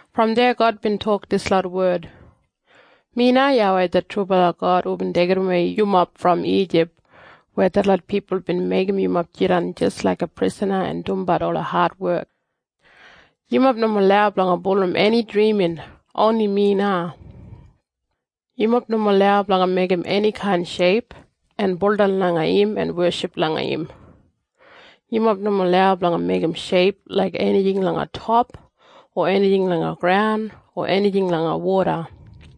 Brom deya God bin tok dislot wed, “Mi na YAWEI det trubala God hubin deigidawei yumob brom Ijip weya detlot pipul bin meigim yumob jidan jis laiga prisana en dumbat ola adwek. “Yumob nomo lau blanga bulurrum eni drimin. Oni mi na. “Yumob nomo lau blanga meigim enikain sheip en baudan langa im en weship langa im. Yumob nomo lau blanga meigim sheip laik enijing langa top o enijing langa graun o enijing langa woda.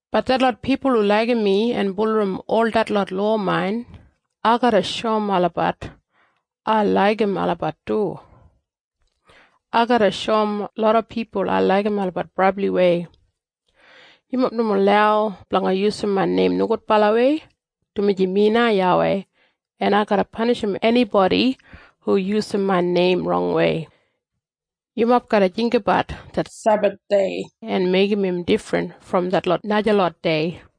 Bat detlot pipul hu laigim mi en bulurrum ol detlot lowa main, ai garra shoum olabat ai laigim olabat du. Ai garra shoum loda pipul ai laigim olabat brabliwei. “Yumob nomo lau blanga yusum main neim nogudbalawei, dumaji mi na YAWEI, en ai garra panishim enibodi hu yusum main neim rongwei. “Yumob garra jinggabat det Sebathdei en meigim im difrin brom detlot najalot dei.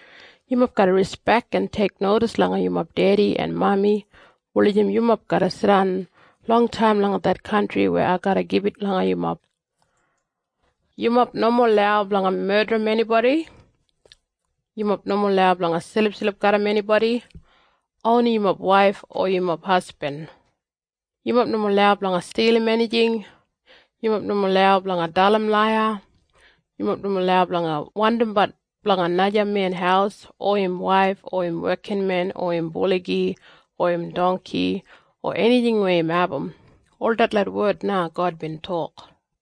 “Yumob garra rispek en teiknodis langa yumob dedi en mami wulijim yumob garra jidan longtaim langa det kantri weya ai garra gibit langa yumob. “Yumob nomo lau blanga medrim enibodi. “Yumob nomo lau blanga silipsilip garram enibodi. Oni yumob waif o yumob hasbin. “Yumob nomo lau blanga stilim enijing. “Yumob nomo lau blanga dalim laiya. “Yumob nomo lau blanga wandimbat blanga naja men haus o im waif o im wekinmen o im buligi o im dongki o enijing weya im abum.” Ol detlot wed na God bin tok.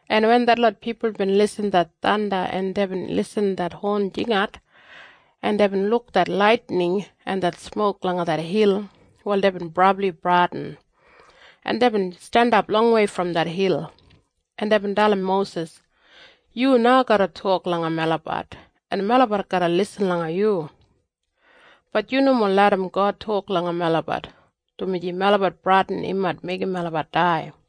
En wen detlot pipul bin irrim det thanda, en deibin irrim det hon jingat, en deibin luk det laitining en det smok langa det hil, wal deibin brabli bradin, en deibin jandap longwei brom det hil, en deibin dalim Mosis, “Yu na garra tok langa melabat, en melabat garra lisin langa yu. Bat yu nomo larram God tok langa melabat, dumaji melabat bradin im mait meigim melabat dai.”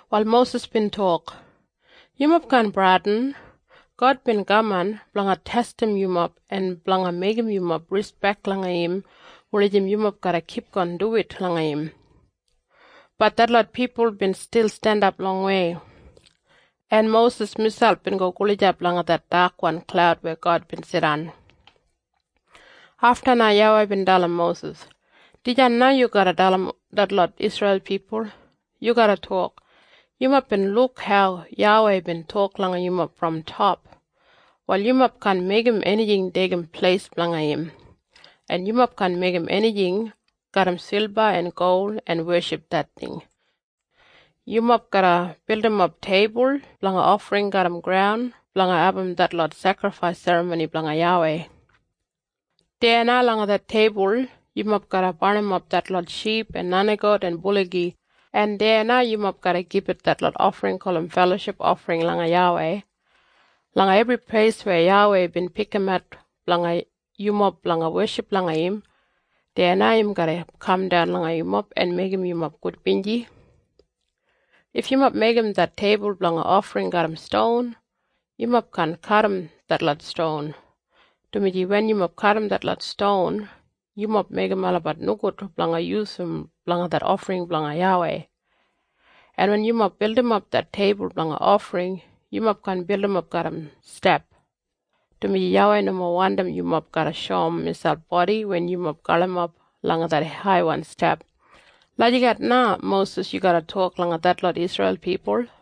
Wal Mosis bin tok, “Yumob kaan bradin. God bin kaman blanga testim yumob en blanga meigim yumob rispek langa im wulijim yumob garra kipgon duwit langa im.” Bat detlot pipul bin stil jandap longwei, en Mosis miselp bin go gulijap langa det dakwan klaud weya God bin jidan. Afta na YAWEI bin dalim Mosis, “Dijan na yu garra dalim detlot Isreil pipul. Yu garra tok, ‘Yumob bin luk hau YAWEI bin tok langa yumob brom top. Wal yumob kaan meigim enijing deigim pleis blanga im, en yumob kaan meigim enijing garram silba en gol en weship det ting. Yumob garra bildimap teibul blanga ofring garram graun blanga abum detlot sekrifais serramoni blanga YAWEI. Deya na langa det teibul yumob garra barnimap detlot ship en nenigout en buligi, en deya na yumob garra gibit detlot ofring gulum feloship ofring langa YAWEI. Langa ebri pleis weya YAWEI bin pikimat blanga yumob blanga weship langa im, deya na im garra kamdan langa yumob en meigim yumob gudbinji. If yumob meigim det teibul blanga ofring garram ston, yumob kaan kadim detlot ston, dumaji wen yumob kadim detlot ston, yumob meigim olabat nogud blanga yusum blanga det ofring blanga YAWEI. En wen yumob bildimap det teibul blanga ofring, yumob kaan bildimap garram step, dumaji YAWEI nomo wandim yumob garra shoum miselp bodi wen yumob galimap langa det haiwan step.’ Lagijat na, Mosis, yu garra tok langa detlot Isreil pipul.”